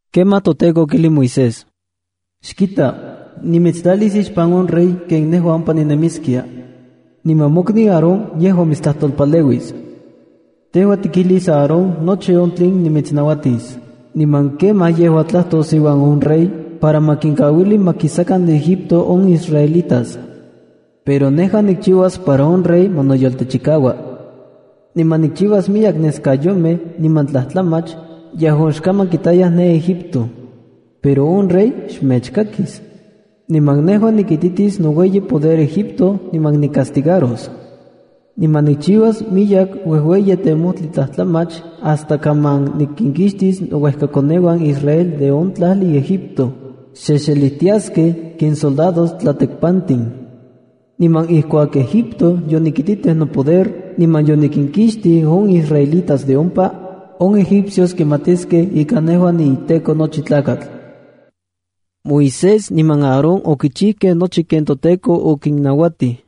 Kemaj toTEKO okijlij Moisés: —Xkita, nimitstlalis ixpan on rey ken nejua ompa ninemiskia. Niman mokniu Aarón mitstlajtolpaleuis. Tejua tikijlis Aarón nochi on tlen timitsnauatis, niman kemaj yejua tlajtos iuan on rey para ma kinkauili ma kisakan de Egipto on israelitas. Pero nejua nikchiuas para on rey ma noyoltechikaua. Niman nikchiuas miyek neskayomej niman tlajtlamach yejuan xkaman kitayaj ne Egipto. Pero on rey xmechkakis. Niman nejua nikititis noueyi poder Egipto niman nicastigaros. Niman nikchiuas miyek uejueyi temojti tlajtlamach hasta kaman nikinkixtia iuejkakoneuan Israel de on tlajli Egipto, xexelijtiaskej ken soldados tlatekpantin. Niman ijkuak Egipto yonikititij nopoder niman yonikinkixtij on israelitas de ompa, on egipcios kimatiskej ika nejua niDios. Moisés niman Aarón okichijkej nochi ken toTEKO okinnauatij.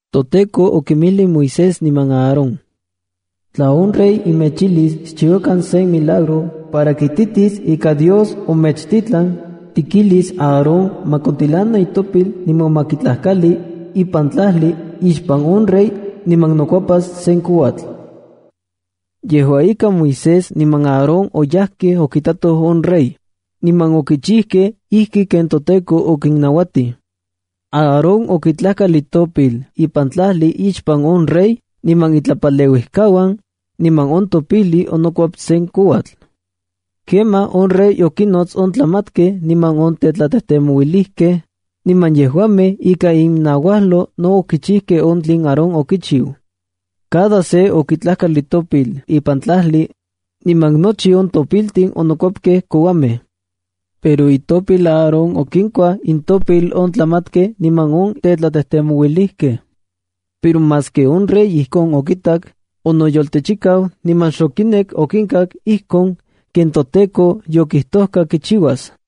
ToTEKO okinmijlij Moisés niman Aarón: —Tla on rey mechijlis xchiuakan sen milagro para kititis ika Dios omechtitlan, tikijlis Aarón ma kontilana itopil niman ma kitlajkali ipan tlajli ixpan on rey niman nokuepas sen kouatl. Yejua ika, Moisés niman Aarón oyajkej okitatoj on rey, niman okichijkej ijki ken toTEKO okinnauatij. Aarón okitlajkal itopil ipan tlajli ixpan on rey niman itlapaleuijkauan, niman on topijli onokuep sen kouatl. Kemaj on rey okinnots on tlamatkej niman on tetlatejtemouilijkej, niman yejuamej ikan innauajlo no okichijkej on tlen Aarón okichiu. Cada se okitlajkal itopil ipan tlajli, niman nochi on topiltin onokuepkej kouamej. Pero itopil Aarón okinkuaj intopil on tlamatkej niman on tetlatejtemouilijkej. Pero maski on rey ijkon okitak, onoyoltechikau niman xokinek okinkak ijkon ken toTEKO yokijtojka kichiuas.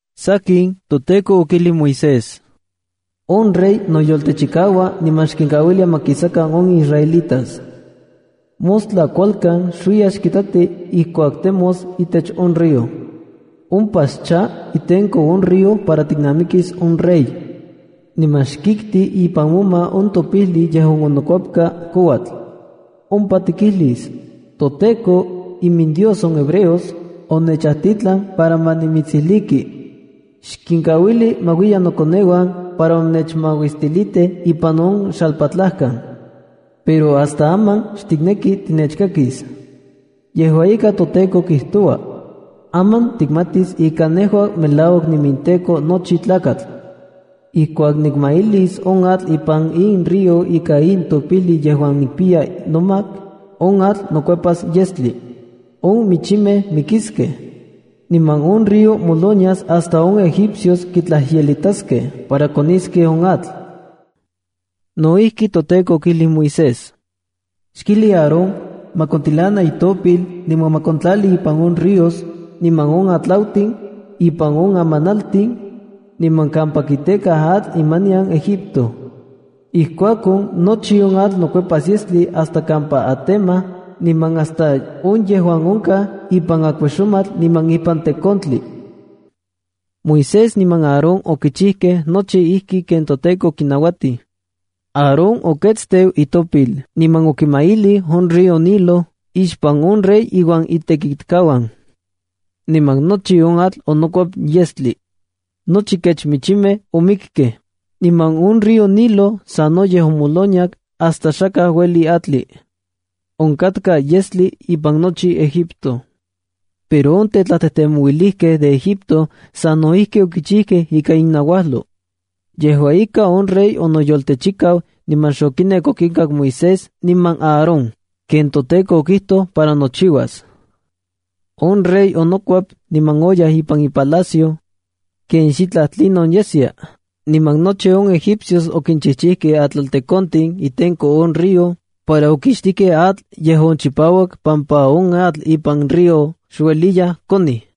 Sakin, toTEKO okijlij Moisés: —On rey noyoltechikaua niman xkinkauilia ma kisakan on israelitas. Mostla kualkan xuiya xkitati ijkuak temos itech on río. Ompa xcha itenko on río para tiknamikis on rey, niman xkikti ipan moma on topijli yejuan onokuepka kouatl. Ompa tikijlis: “ToTEKO, iminDios on hebreos, onechajtitlan para ma nimitsijliki: Xkinkauili ma uiyan nokoneuan para ma nechmauistilitij ipan on xalpatlajkan. Pero hasta aman xtikneki tinechkakis. Yejua ika, toTEKO kijtoua: Aman tikmatis ika nejua melauak niiminTEKO nochi tlakatl. Ijkuak nikmailis on atl ipan in río ika in topijli yejuan nikpiya nomak, on atl nokuepas yestli. On michimej mikiskej, niman on río molonias hasta on egipcios kitlajyelitaskeja para koniskej on atl.” No ijki, toTEKO okijlij Moisés: —Xkijli Aarón ma kontilana itopil niman ma kontlali ipan on ríos, niman on atlautin, ipan on amanaltin, niman kampa kitekaj atl imanian Egipto. Ijkuakon, nochi on atl nokuepas yestli hasta kampa atemaj niman hasta on yejuan onkaj ipan akuejxomatl niman ipan tekontli. Moisés niman Aarón okichijkej nochi ijki ken toTEKO okinnauatij. Aarón oketsteu itopil niman okimailij on río Nilo ixpan on rey iuan itekitkauan. Niman nochi on atl onokuep yestli. Nochi kech michimej omikej, niman on río Nilo sanoyej omoloniak hasta xakaj ueliya atli. Onkatka yestli ipan nochi Egipto. Pero on tetlatejtemouilijkej de Egipto sa no ijki okichijkej ika innauajlo. Yejua ika, on rey onoyoltechikau niman xokinek okinkak Moisés niman Aarón, ken toTEKO okijtoj para nochiuas. On rey onokuep niman oyaj ipan ipalacio, ken xitlaj tlinon yeskia. Niman nochi on egipcios okinchijchijkej atlaltekontin itenko on río para okixtijkej atl yejuan chipauak pampa on atl ipan río xueliya konij.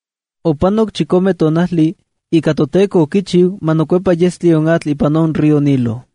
Opanok chikome tonajli ika toTEKO okichiu ma nokuepa yestli on atl ipan on río Nilo.